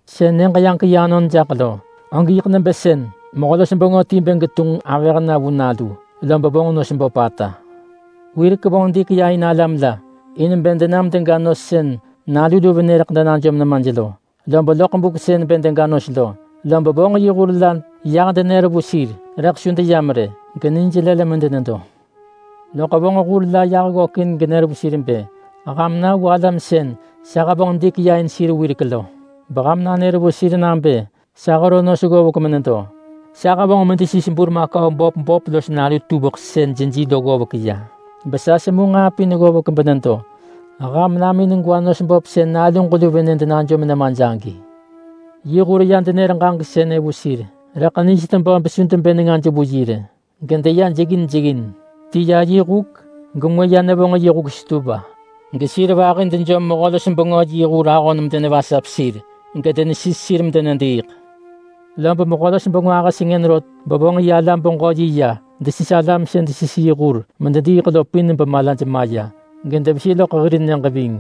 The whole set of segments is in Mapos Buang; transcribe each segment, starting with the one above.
“Sën Nyëġ-yaġek-yi anon jaḳ lo, og yiḳ nebë sën mehö-los-bengö ti bë getunġ avëh na vu nalu, lob vonġ nos böpata. Wirek vonġ dik ya in alam la in bë denam dega nos sën nalu lu venë rëḳ denajom nemaj lo, lob loḳ buk sën bë dega nos lo, lob vonġ yi hur la yah denër vu sir. Rëḳ su deyam rë, genij nelël medenedo. Lob vonġ hur la yah ggökin genër vu sir bë, ‘Ham na vu alam sën sa hevonġ dik ya in sir wirek lo, beham nanër vu sir nabë sa hero nos ggovek menedo. Sa hevonġ medesis burmakau böp böp los nalu tuveḳ sën jeji lo ggovek ya. Besa semu nġaa pin ggovek benedo. Ham nam in gwa nos böp sën naluġ lu venë denejom nemaj!’ Yi hur ya denër ġaġek sënë vu sir, rëḳ nij tebö besu debë nengaj vu rë, gedeya jeggin jeggin. Ti ya yi huk, gengwë ya nevonġ yi huk stewa, gesir vahi dejom mehö-los-bengö yi hur ahon medenevasap sir, gedenesis sir medenediiḳ. Lob mehö-los-bengö ahë sengën rot bevonġ yi alam-beġö-yi ya desis alam sën desis yi hur medediiḳ lo pin bemalaj maya, gedevesi loḳ hir nyëġ ving.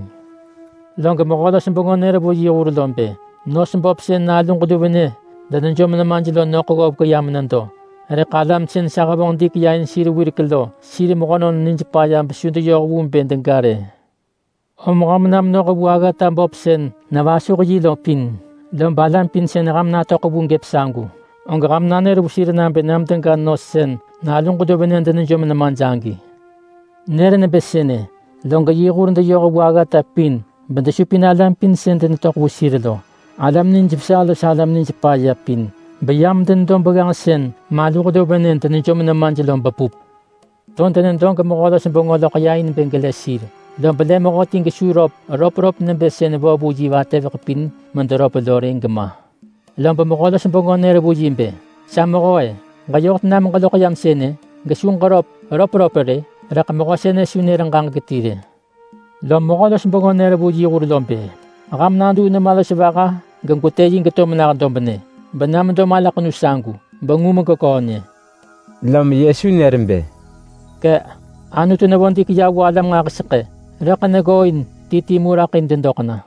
Log mehö-los-bengö nër vu yi hur lo bë, ‘Nos böp sën naluġ lu venë denejom nemaj lo nöḳ ggovek ya menedo, rëḳ alam sën sa hevonġ dik ya in sir wirek lo, sir mehönon nij paya besu deyoh vu bë dega rë. Om ham na menoh vu aggata böp sën nevasuh yi lo pin, lob alam pin sën ham natöḳ vu gëp sagu, og ham nanër vu sir nabë nam dega nos sën naluġ lu venë denejom nemaj agi!’ Nër nebë sënë, log yi hur deyoh vu aggata pin bedesupin alam pin sën denetöḳ vu sir lo, alam nijvesa losho alam nij paya pin. Beyam denedo begganġ sën maluh lu venë denejom nemaj lo bepup. To denedo gemehö-los-bengö loḳ ya in bë gelë sir. Lob lë mehöti gesu röp röpröp nebë sën vo vu yi vatëveḳ pin mederöp lo rë, gema. Lob mehö-los-bengö nër vu yi bë, ‘Sa mehö-e! Ġeyoh tena meġeloḳ yam sënë gesu ġeröp röpröp rë?’ Rëḳ mehö sënë su nër ġaġek ti rë. Lom mehö-los-bengö nër vu yi hur lo bë, ‘Ham naduu nema los vaha gegwetë yi geto mena dobnë, bena medo malaḳenu sagu, bengu megeköö nyë!’” Lom Yesu nër bë, “Kë”, Anutu nevonġ dik ya vu alam nġahiseḳë, rëḳ neggooin ti ti mu raḳ in dedoḳ na!”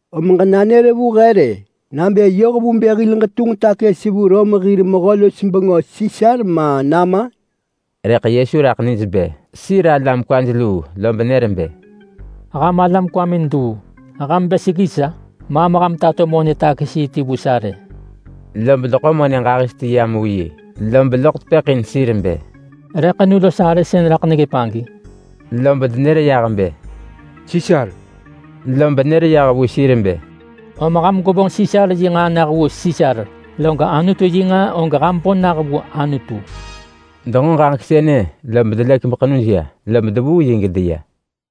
Om ġenanër vu he rë, nabë yoh vu bë hil ġetunġ takës vu alam Rom hir mehö-los-bengö Sisar ma nama?” Rëḳ Yesu raḳ nij bë sir alam kwaj luu lob nër bë, “Ham alam kwamin luu! Ham bë seggi sa? Maam ham tato monë-takës-yi ti vu sa rë!” Lob deḳo monë ġahis ti yam vu yi, lob loḳ tepëḳ in sir bë, “Re ḳenu los arë sën raḳ neggëp agi?” Lob denër yah bë, “Sisar!” Lob nër yah vu sir bë, “Om ham gwevonġ Sisar yi nġaa nah vu Sisar, log Anutu yi nġaa og ham bo nah vu Anutu!” Denġo ġaġek sënë lob delëk beḳenuj ya. Lob devuu yi gedeya.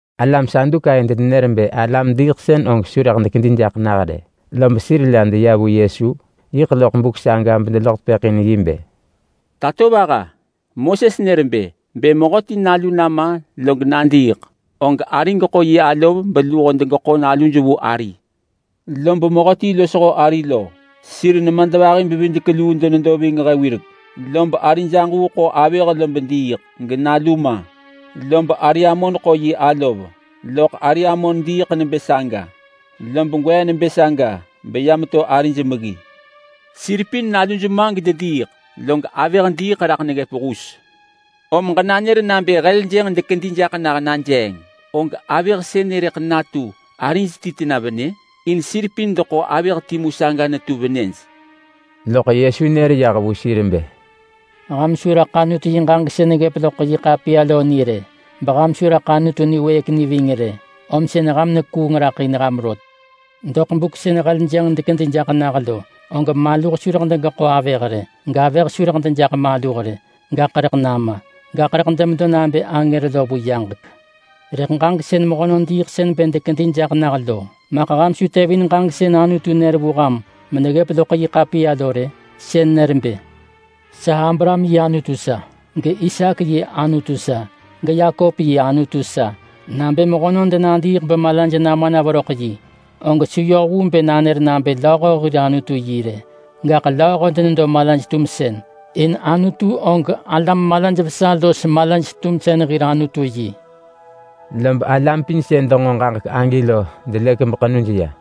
Alam Sadukai denenër bë alam-diiḳsën og su rëḳ dekedi jaḳ nah rë. Lob sir la deya vu Yesu yiḳ loḳ buk saga bedeloḳ tepëḳ in yi bë, “Tatovaha! Moses nër bë, ‘Bë mehöti nalu nama log nadiiḳ, og ari geḳo yi alov beluho degeḳo naluj vu ari.’ Lob mehöti losho ari lo, sir nemadvahi-bevidek-luu denedo ving he wirek. Lob arij aġuu ḳo avëh lob diiḳ, genalu ma. Lob ari amon ḳo yi alov, loḳ ari amon diiḳ nebë saga, lob gwee nebë saga beya meto arij meggi. Sir pin naluj ma gedediiḳ, log avëh diiḳ raḳ neggëp hus. Om ġenanër nabë najeeng sën mehönon diiḳsën dekedi jaḳ nah lo, og avëh sënë rëḳ natu arij ti tena venë? In sir pin deḳo avëh timu saga netu venëj.” Loḳ Yesu nër yah vu sir bë, “Ham su raḳ Anutu yi ġaġek sën neggëp loḳ yi ḳapiya lo ni rë! Beham su raḳ Anutu niwëëk ni ving rë! Om sën ham nekuung raḳ in ham rot. Vu buk sën mehönon diiḳsën dekedi jaḳ nah lo, og maluh su rëḳ degeḳo avëh rë, gavëh su rëḳ dejaḳ maluh rë, gaḳ rëḳ nama. Gaḳ rëḳ demedo nabë angër lo vu yaġek. Rëḳ ġaġek sën mehönon diiḳsën bë dekedi jaḳ nah lo! Maḳ ham su tevin ġaġek sën Anutu nër vu ham meneggëp loḳ yi ḳapiya lo rë? Sën nër nebë, ‘Sa Abraham yi Anutu sa, gIsaak yi Anutu sa, geYakop yi Anutu sa.’ Nabë mehönon denadiiḳ bemalaj nama na veröḳ yi, og su yoh vu bë nanër nabë lööho hir Anutu yi rë, gaḳ lööho denedo malaj-tumsën, in Anutu og alam malaj vesa los malaj-tumsën hir Anutu yi.” Lob alam pin sën denġo ġaġek agi lo delëk beḳenuj ya.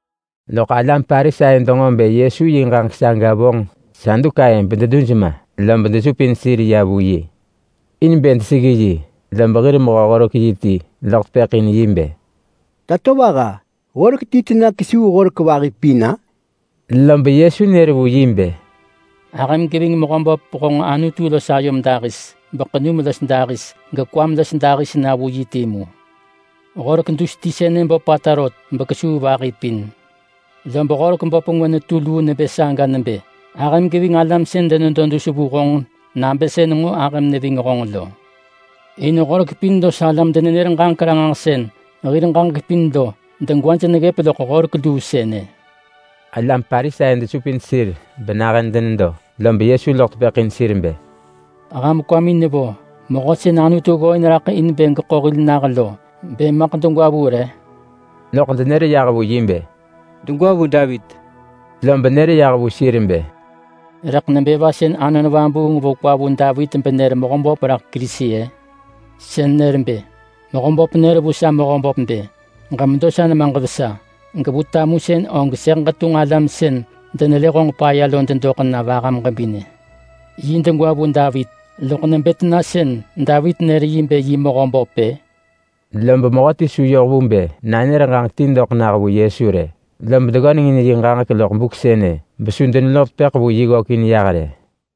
Loḳ alam Parisai denġo bë Yesu yi ġaġek saga vonġ Sadukai bededuj ma, lob desupin sir ya vu yi in bë deseggi yi, lob hir mehö-horek-yi ti loḳ tepëḳ in yi bë, “Tatovaha! Horek ti tena kesuu horek vahi pin-a?” Lob Yesu nër vu yi bë, “Ahëm geving Mehöböp honġ Anutu los ayom dahis, beḳenum los dahis, gekwam los dahis na vu yi timu. Horek dus ti sënë böpata rot bekesuu vahi pin. Lob horek böp ngwë netu luu nebë saga nebë, ‘Ahëm geving alam sën denedo dus vu honġ nabë sën nġo ahëm neving honġ lo.’ In Horek pin los alam-denenër-ġaġek-ranġahsën hir ġaġek pin lo degwaj neggëp loḳ horek luu sënë.” Alam Parisai desupin sir benahën denedo, lob Yesu loḳ tepëḳ in sir bë, “Ham kwamin nevo Mehö sën Anutu ggooin raḳ in bë geḳo hil nah lo bë maḳ degwa vu re?” Loḳ denër yah vu yi bë, “Degwa vu Davit.” Lob nër yah vu sir bë, “Rëḳ nebë va sën Anon Vabuung vo kwa vu Davit benër Mehöböp raḳ Kerisi-ë? Sën nër bë: ‘Mehöböp nër vu sa Mehöböp nebë: “Ġemedo sa nemaġ vesa. Gevu tamusën og sëḳ ġetunġ alam sën denelë honġ paya lo dedoḳ na vaham ġebinë.” ’ Yi degwa vu Davit, loḳ nebë tena sën Davit nër yi bë yi Mehöböp-ë?” Lob mehöti su yoh vu bë nanër ġaġek ti doḳ nah vu Yesu rë. Lob deggönengin yi ġaġek loḳ buk sënë, besu deneloḳ tepëḳ vu yi ggökin yah rë.